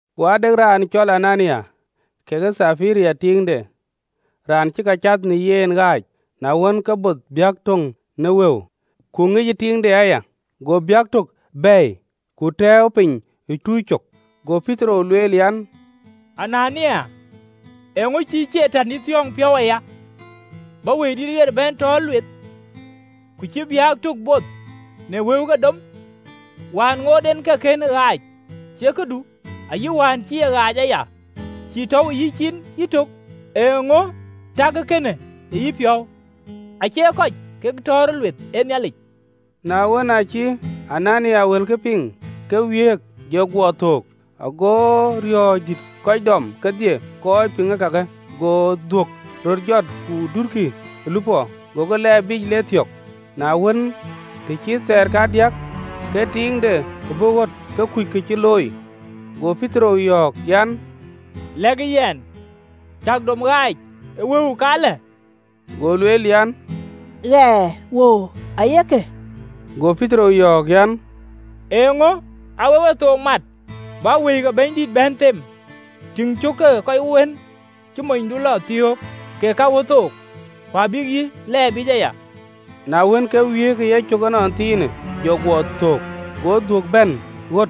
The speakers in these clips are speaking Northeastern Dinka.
Ku ade raan cɔl Anania, kekë Thapira tiiŋde, raan cï ka cath në yen ɣaac. Na wën, ke both biäk tök në wëu, ku ŋic tiiŋde aya, go biäk tök bɛ̈ɛ̈i, ku tɛ̈ɛ̈u piny ë tuuc cök. Go Petero lueel an, “Anania, eeŋö cï Catan yï thiɔ̈ɔ̈ŋ piɔ̈u aya, bä Wëidït ɣer bɛ̈n tɔ̈ɔ̈r lueth, ku cï biäk tök both në wëu ke dom? Wään ŋoot en ke kënë ɣaac, ë cie këdu? Ayï wään cï e ɣaac aya, ë cïï tɔ̈u ë yïcin yïtök? Eeŋö täkë kënë ë yïpiɔ̈u? Acie kɔc kek ë tɔ̈ɔ̈rë lueth, ee Nhialic!” Na wën, aacï Anania wëlkë piŋ, ke wiëëk, jɔ guɔ thöök: ago riɔ̈ɔ̈c dït kɔc dɔm kedhie kɔc piŋ kake. Go dhuök röt jɔt, ku dutkï ë lupɔ, gokï lɛɛr biic lek thiɔ̈k. Na wën, të cït thaar kadiäk, ke tiiŋde bɔ̈ ɣöt, ke kuc kë cï looi. Go Petero yɔ̈ɔ̈k an, “lɛ̈kë yɛn, cäk dom ɣaac ë wëu käklë?” Go lueel an, “Ɣɛɛ, wëu ayek lë.” Go Petero yɔ̈ɔ̈k an, “Eeŋö aa wek wethook mat, bäk Wëi ke Bɛ̈nydït bɛ̈n them? Tïŋ, cök ke kɔc wën cï monydu lɔ thiɔ̈k, kek ka ɣöt thok, ku abïk yï lɛɛr biic aya!” Na wën, ke wiëëk ë yecök ënɔnthiinë, jɔ guɔ thöök: go dhuök bɛ̈n ɣöt,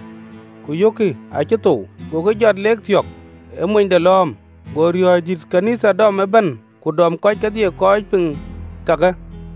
ku yökkï acï thou, gokï jɔt, le thiɔ̈k ë monyde lɔ̈ɔ̈m. Go riɔ̈ɔ̈c dït ɣön ë Nhialic dɔm ëbɛ̈n, ku dɔm kɔc kedhie kɔc piŋ kakë.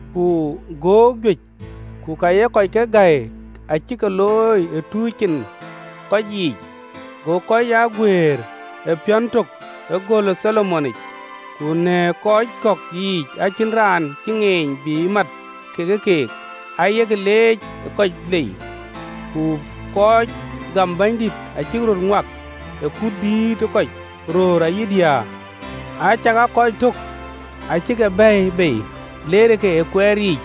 Ku göök juëc ku ka ye kɔc ke gäi acï ke looi ë tuuc cin ë kɔc yiic: go kɔc aa guëër ë piɔ̈n tök ë göl ë Tholomonic. Ku në kɔc kɔ̈k yiic acïn raan cï ŋeeny bï mat kekë keek: aye ke leec ë kɔc lei. Ku kɔc gam Bɛ̈nydït acïk röt ŋuak ë kuut dïït ë kɔc, röör ayï diäär. Acakaa kɔc tök acï ke bɛ̈ɛ̈i bei, leerë ke ë kuɛɛr yiic,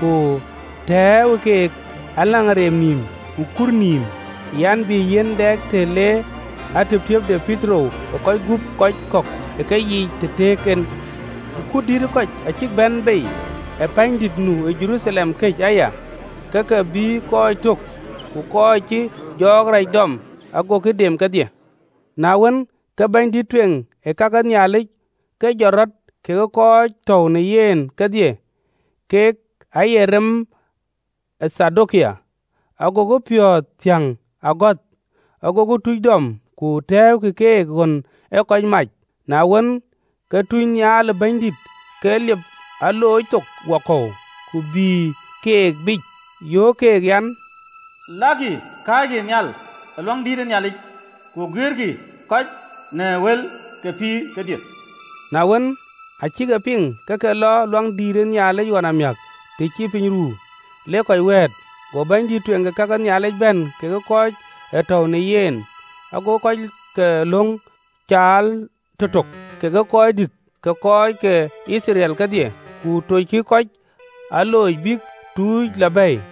ku tɛ̈ɛ̈uwë keek në ageen nïïm ku thöc nïïm an, bï yiɛ̈n dɛ të le atïptïïp de Petero ë kɔc gup kɔc kɔ̈k ë keyiic, të tëëk en. Ku kut dïït ë kɔc acïk bɛ̈n bei ë wuöt nu ë Jeruthalem këc aya, ke ke bïï kɔc tök ku kɔc cïï jɔɔk rac dɔm: agokï dem kedhie. Na wën, ke bɛ̈nydïït ë kake Nhialic ke jɔt rɔt, kekë kɔc ë tɔ̈u në yen kedhie (kek aye rem ë Thadokai), agokï piɔ̈ɔ̈th thiäŋ ë agɔ̈th, agokï tuuc dɔm, ku tɛ̈ɛ̈ukï keek ɣön ee kɔc mac. Na wën, ke tunynhial ë Bɛ̈nydït ke liep alooc thok wakɔ̈u, ku bïï keek biic, yöök keek, an, “Lakï, kääckï nhial ë Luaŋdïtic, ku guiëërkï kɔc në wël ke pïïrë kedhie.” Na wën, aa cïk e piŋ, ke ke lɔ Luaŋdïtic ɣɔn amiäk të cï piny ruu, lek kɔc wɛ̈ɛ̈t. Go bɛ̈nydïït ë kake Nhialic bɛ̈n kekë kɔc ë tɔ̈u në yen, gokï kɔc ke löŋ caal tëtök, kekë röördït ke kɔc ke Yithriɛl kedhie, ku toockï kɔc aloocic bïk tuuc lɔ bɛ̈ɛ̈i.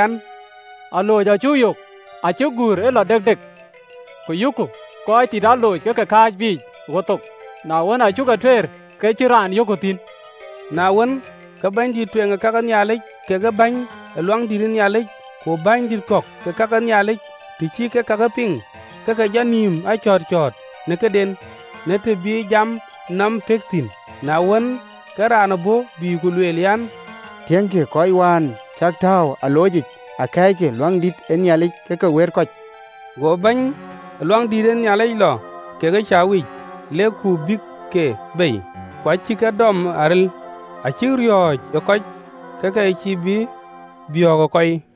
an, “Alooc acuk yök acï guur ë lɔ dekdek, ku yökku kɔc tit aloc ke ke kääc biic ɣöt thok: na wën, aa cuk e tueer, ke cïn raan yökku thïn!” Na wën, ke bɛ̈nydïït ë kake Nhialic, kekë bɛ̈ny ë Luaŋdït, ku bänydït kɔ̈k ë ka ke Nhialic, të cï kek kake piŋ, ke ke jɔ nïïm a cɔ̈ɔ̈t cɔ̈ɔ̈t në këden, në të bï jam nɔm pëk thïn. Na wën, ke raan bɔ̈, bï ku lueel an, “Tiëŋkï, kɔc wään cäk tääu ë aloocic akɛ̈ɛ̈ckï ë luaŋdït yic, ke ke wëët kɔc!” Go bɛ̈ny ë Luaŋdït lɔ kekë bäny ke rem, lek ku bïïkï ke bei, ku cïkï ke dɔm aril, acïk riɔ̈ɔ̈c ë kɔc, ke ke cïï bï biɔ̈ɔ̈k ë kɔi.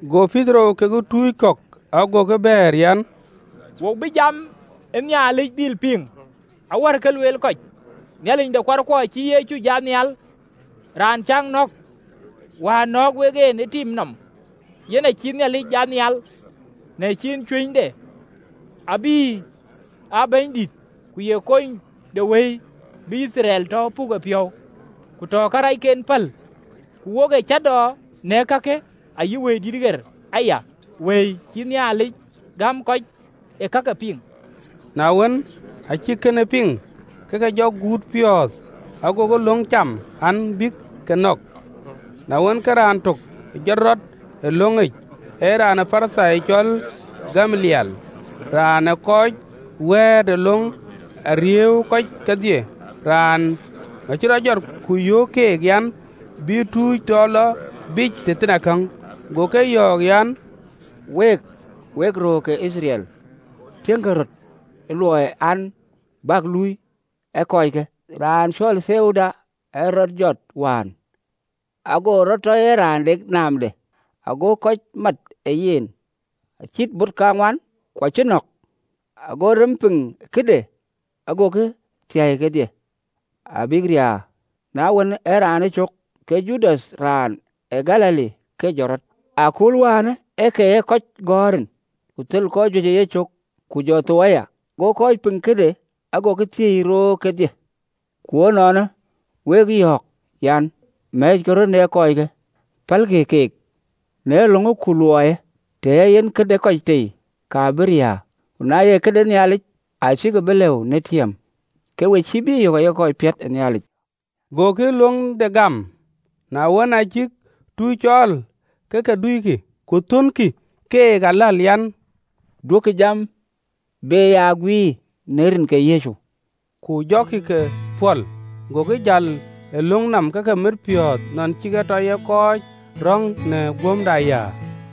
Go Petero kekë tuuc kɔ̈k agokï bɛ̈ɛ̈r an, “Wo bï jam e Nhialic dhil piŋ awär ke lueel kɔc. Nhialic de kuarkuɔ acï Yecu jat nhial, raan cäk nɔ̈k, wään nɔ̈ɔ̈k wek en ë tim nɔm. Yen acïï Nhialic jat nhial në ciin cuënyde, abï aa Bɛ̈nydït ku ye Konydewëi, bï Yithriɛl tɔ puk e piɔ̈u, ku tɔ karɛcken päl. Ku wok ee cäätɔɔ në kakë, ayï Wëidït ɣer aya, Wëi cï Nhialic gäm kɔc ë kake piŋ.” Na wën, aa cïk kënë piŋ ke ke guutë piɔ̈ɔ̈th, gokï löŋ cam an, bïk ke nɔ̈k. Na wën, ke raan tök jɔt rɔt ë löŋic, ee raan ë Parithai, cɔl Gamaliɛl, raan ë kɔc wɛ̈ɛ̈t ë löŋ, arïïuwë kɔc kedhie, raanë acï rɔt jɔt, ku yöök keek an, bï tuuc tɔ lɔ biic tëthiinakäŋ. Go kɔc yɔ̈ɔ̈k an, “Week, wek röör ke Yithriɛl, tiëŋkï röt ë luɔi an, bäk luöi kɔckë. Raan cɔl Theuda ë rɔt jɔt wään, ago rɔt tɔ ye raan de naamde, ago kɔc mat ë yen, acït bot kaŋuan: ku acï nɔ̈k, ago rem piŋ këde agokï thiäi kedhie, abïk riäär. Na wën, ee raanë cök, ke Judath raan de Galili ke jɔt rɔt, ë akööl wään ë ke kɔc gɔ̈ɔ̈r rin, ku thel kɔc juëc ë yecök: ku jɔ thou aya, go kɔc piŋ këde agokï thiëi roor kedhie. Ku ënɔɔnë, wek yɔ̈ɔ̈k an, Mɛ̈ɛ̈ckï röt në kɔckë, pälkï keek: na löŋë ku luɔiyë, të ee yen këde kɔc tei, ka bï riääk: ku na ye këde Nhialic, acäkï bï lëu në tiëm, ke we cïï bï yök aye kɔc piɔ̈t ë Nhialic!” Gokï löŋde gam: na wën, aa cïk tuuc cɔɔl, ke ke duikï, ku thɔnkï keek aläl an, Duökï jam be ya guiir në rin ke Yecu: ku jɔkï ke pɔ̈l. Gokï jäl ë löŋ nɔm, ke ke mit piɔ̈ɔ̈th nɔn cï ke tɔ ye kɔc röŋ në guöm de ayäär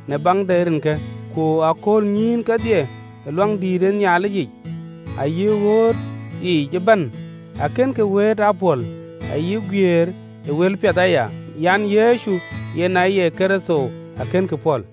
në baŋ de Rinke. Ku aköölnyïïn kedhie, ë Luaŋdïtic ayï ɣööt yiic ëbɛ̈n, akënkï wëët aa pɔ̈l, ayï guiëër ë wëlpiɛth aya an, Yecu yen aye Kërtho, akënkï pɔ̈l.